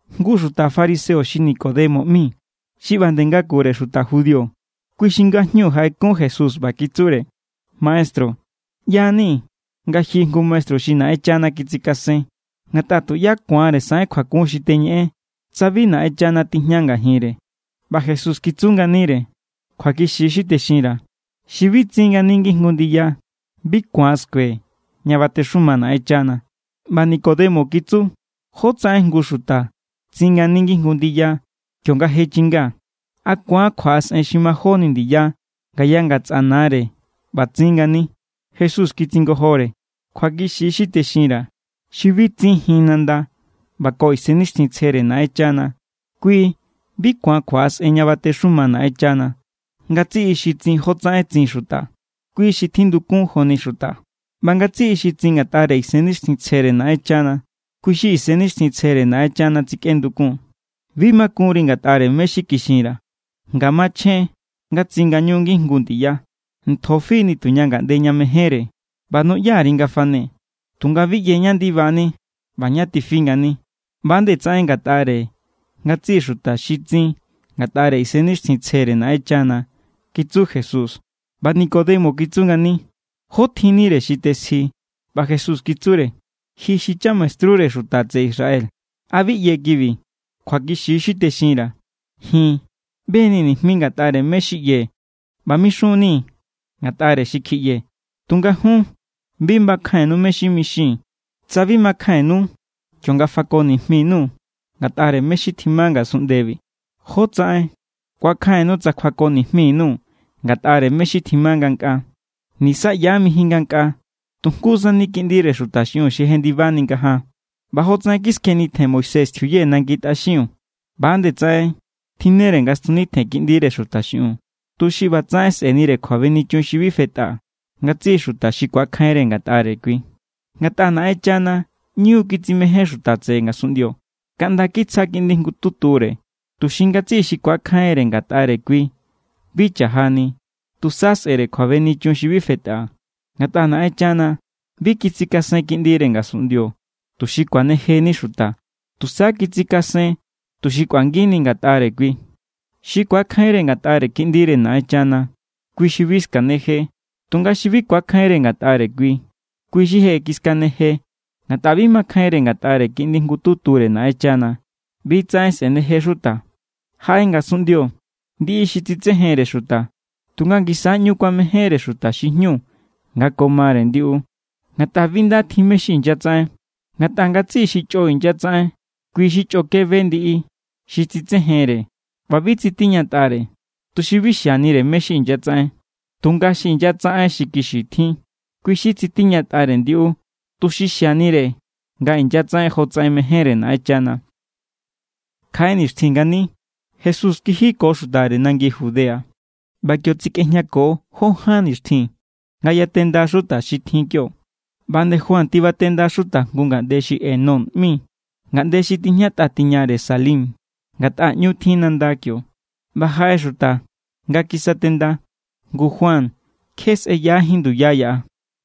Jngu xuta fariseo xi Nicodemo ꞌmi, xi ꞌba nde ngakure xuta judío, kui xi ngajñu jaꞌekun Jesús ꞌba kitsure: —Maestru, ꞌya=ni nga ji jngu maestru xi Naꞌenchana kitsikasen. Ngatꞌa tuꞌyá ku̱anre saꞌen kjuakun xi teñeꞌen tsa bi Naꞌenchana tijña ngajinre. ꞌBa Jesús kitsu nganire: —Kjuakixi= xi texinra̱. Xi bi tsin ngani ngijngu ndiya, kui bi ku̱an skue ña batexuma Naꞌenchana. ꞌBa Nicodemo kitsu: —¿Jótsaꞌen jngu xuta tsin ngani ngijngu ndiya kionga je chinga? ¿A ku̱an kjuaꞌasꞌen xi majóni ndiya ngaya ngatsꞌa nare ꞌba tsin ngani? Jesús kitsingojore: —Kjuakixi= xi texinra̱. Xi bi tsinjin nanda ꞌba ko Isennixtjintsjere Naꞌenchana, kui bi ku̱an kjuaꞌasꞌen ña batexuma Naꞌenchana. Ngatsiꞌi xi tsin jotsaꞌen tsin xuta, kui xi tjindukun joni xuta. ꞌBa ngatsiꞌi xi tsin ngatꞌare Isennixtjintsjere Naꞌenchana, kui= xi Isennixtjintsjere Naꞌenchana tsikꞌendukun. Bi makunri ngatꞌare mé= xi kixinra̱, nga machjen= nga tsin ngañu ngijngu ndiya. Ntjo fi= nituña ngaꞌnde nga mejénre, ꞌba nuꞌya_ri nga fane. Tunga bi ꞌye ñá ndibani ꞌba ña tifi ngani. ꞌBa=nde tsaꞌen ngatꞌare ngatsiꞌi xuta xi tsin ngatꞌare Isennixtjintsjere Naꞌenchana —kitsu Jesús. ꞌBa Nicodemo kitsu ngani: —¿Jó tjinnire xi tesji? ꞌBa Jesús kitsure: —Ji xi chamaestrure xuta tseꞌe Israel. ¿A bi ꞌye kibi? Kjuakixi= xi texinra̱. Ji̱n ꞌbe=nii̱ nijmi ngatꞌare mé= xi ꞌyee̱ ꞌba mixun=nii̱ ngatꞌare xi kjiꞌyee̱, tunga jun bi makjainnu mé= xi mixii̱n. Tsa bi makjainnu kionga fako nijmi_nuu̱ ngatꞌare mé= xi tjima ngasunꞌndebi, ¿jótsaꞌen ku̱akjainnu tsa kjuako nijmi_nuu̱ ngatꞌare mé= xi tjima ngankꞌaa? ’Nisaꞌyajín mijin ngankꞌaa. Tu jngu sani Kiꞌndire Xuta xiꞌiun xi jendibajenni ngajaan. ꞌBa jotsaꞌen kiskjenitjen Moisés tjiuye nangi tꞌaxiun, ꞌba=nde tsaꞌen tjinnere nga stjunitjen Kiꞌndire Xuta xiꞌiun, tuxi ꞌbatsaꞌen sꞌe̱nire kjuabenichun xi bi fetꞌa ngatsiꞌi xuta xi ku̱akjainre ngatꞌare kui. ’Ngatꞌa Naꞌenchana ꞌñu= kitsimején xuta tseꞌe ngasunꞌndio kaꞌnda kitsja Kiꞌndi jngututure, tuxi ngatsiꞌi xi ku̱akjainre ngatꞌare kui bi cha̱jani, tusa sꞌe̱re kjuabenichun xi bi fetꞌa. Ngatꞌa Naꞌenchana bi kitsikasen Kiꞌndire ngasunꞌndio tuxi kuanejeni xuta. Tusa kitsikasen tuxi kꞌuangini ngatꞌare kui. ’Xi ku̱akjainre ngatꞌare Kiꞌndire Naꞌenchana, kui xi bi skaneje. Tunga xi bi ku̱akjainre ngatꞌare kui, kui= xi je kiskaneje ngatꞌa bi makjainre ngatꞌare Kiꞌndi jngututure Naꞌenchana. ꞌBi= tsaꞌen sꞌeneje xuta. Jaꞌe ngasunꞌndio ndiꞌi xi tsitsejenre xuta, tunga ngisa= ꞌñu kuamejénre xuta xi jñu nga ko mare ndiꞌu, ngatꞌa bi nda tjin mé= xi inyatsaꞌen. Ngatꞌa ngatsiꞌi xi chꞌo inyatsaꞌen, kui= xi chꞌoke be ndiꞌi xi tsitsejenre ꞌba bi tsitiñatꞌare, tuxi bi xianire mé= xi inyatsaꞌen. Tunga xi inyatsaꞌen xi kixi tjin, kui= xi tsitiñatꞌare ndiꞌu, tuxi xianire nga inyatsaꞌen jotsaꞌen mejénre Naꞌenchana. Kjaꞌe nixtjin ngani Jesús kiji ko xutare nangi Judea. ꞌBa kio tsekꞌejñako jó ján nixtjin nga yatenda xuta xi tjin kio. ꞌBa nde Juan tibatenda xuta jngu ngaꞌnde xi Enón ꞌmi, ngaꞌnde xi tijñatꞌa tiñare Salim, ngatꞌa ꞌñu tjin nanda kio, ꞌba jaꞌe xuta nga kisatenda. Ngu Juan kje sꞌeyajín nduya yaꞌa.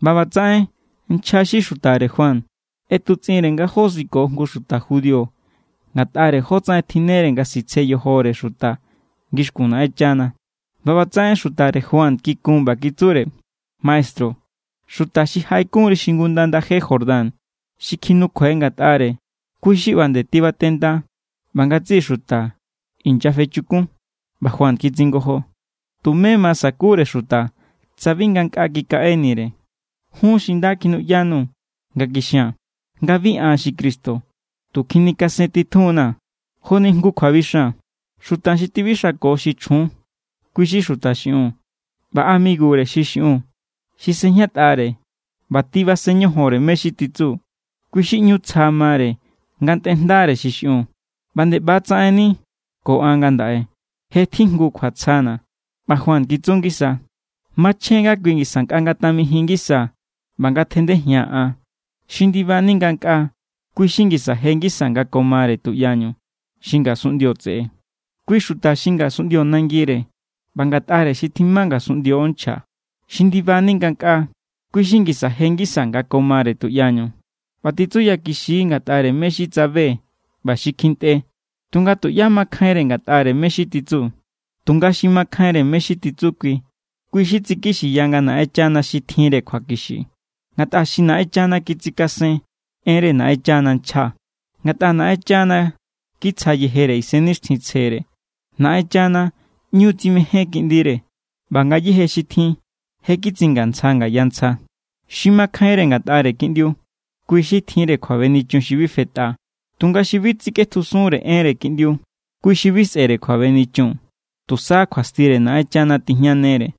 ꞌBa ꞌbatsaꞌen nchja xi xutare Juan ꞌetutsꞌinre nga josiko jngu xuta judío ngatꞌare jótsaꞌen tjinnere nga sitsje yojore xuta ngixkun Naꞌenchana. ꞌBa ꞌbatsaꞌen xutare Juan kikun ꞌba kitsure: —Maestru, xuta xi jaꞌekunri xingunda ndaje Jordán xi kjinukjuai ngatꞌare, kui= xi ꞌba nde tibatenda ꞌba ngatsiꞌi xuta inyafechukun. ꞌBa Juan kitsingojo: —Tumé ma sakure xuta tsa bi ngankꞌaa kikaꞌenire. Jun= xi nda kjinuꞌyanu nga kixia̱n, nga bi an xi Cristo, tu kjinikasentitjun=na̱. Joni jngu kjuabixan. Xuta xi tibixanko xi chjun, kui= xuta xi xiꞌiun. ꞌBa amigure xi xiꞌiun xi sejñatꞌare ꞌba tibasen ñojonre mé= xi titsu, kui= xi ꞌñu tsja mare nga ntꞌere jndare xi xiꞌiun. ꞌBa nde ꞌba= tsaꞌenni ko an ngandaꞌe. Je tjijngu kjuatsjana̱. ꞌBa Juan kitsu ngisa: —Machjen= nga kui ngisa nkꞌa ngatamijin ngisa, ꞌba ngatjandejia̱n an. ’Xi ndibani ngankꞌaa, kui= xi ngisa je ngisa nga ko mare tuꞌyañu. Xi ngasunꞌndio tseꞌe, kui= xuta xi ngasunꞌndio nangire ꞌba ngatꞌare xi tjima ngasunꞌndio nchja. Xi ndibani ngankꞌaa, kui= xi ngisa je ngisa nga ko mare tuꞌyañu ꞌba titsuyakixi= ngatꞌare mé= xi tsabe ꞌba xi kjintꞌe. Tunga tuꞌyá makjainre ngatꞌare mé= xi titsu. Tunga xi makjainre mé= xi titsu kui, kui= xi tsikixiya nga Naꞌenchana xi tjinre kjuakixi. Ngatꞌa xi Naꞌenchana kitsikasen, enre Naꞌenchana nchja, ngatꞌa Naꞌenchana kitsja yejere Isennixtjintsjere. Naꞌenchana ꞌñu= tsimején Kiꞌndire, ꞌba ngayéje xi tjin je kitsingantsja ngaya ntsja. Xi makjainre ngatꞌare Kiꞌndiu, kui= xi tjinre kjuabenichun xi bi fetꞌa. Tunga xi bi tsikꞌetjusunre enre Kiꞌndiu, kui xi bi sꞌe̱re kjuabenichun. Tusa kjuastire Naꞌenchana tijñanere.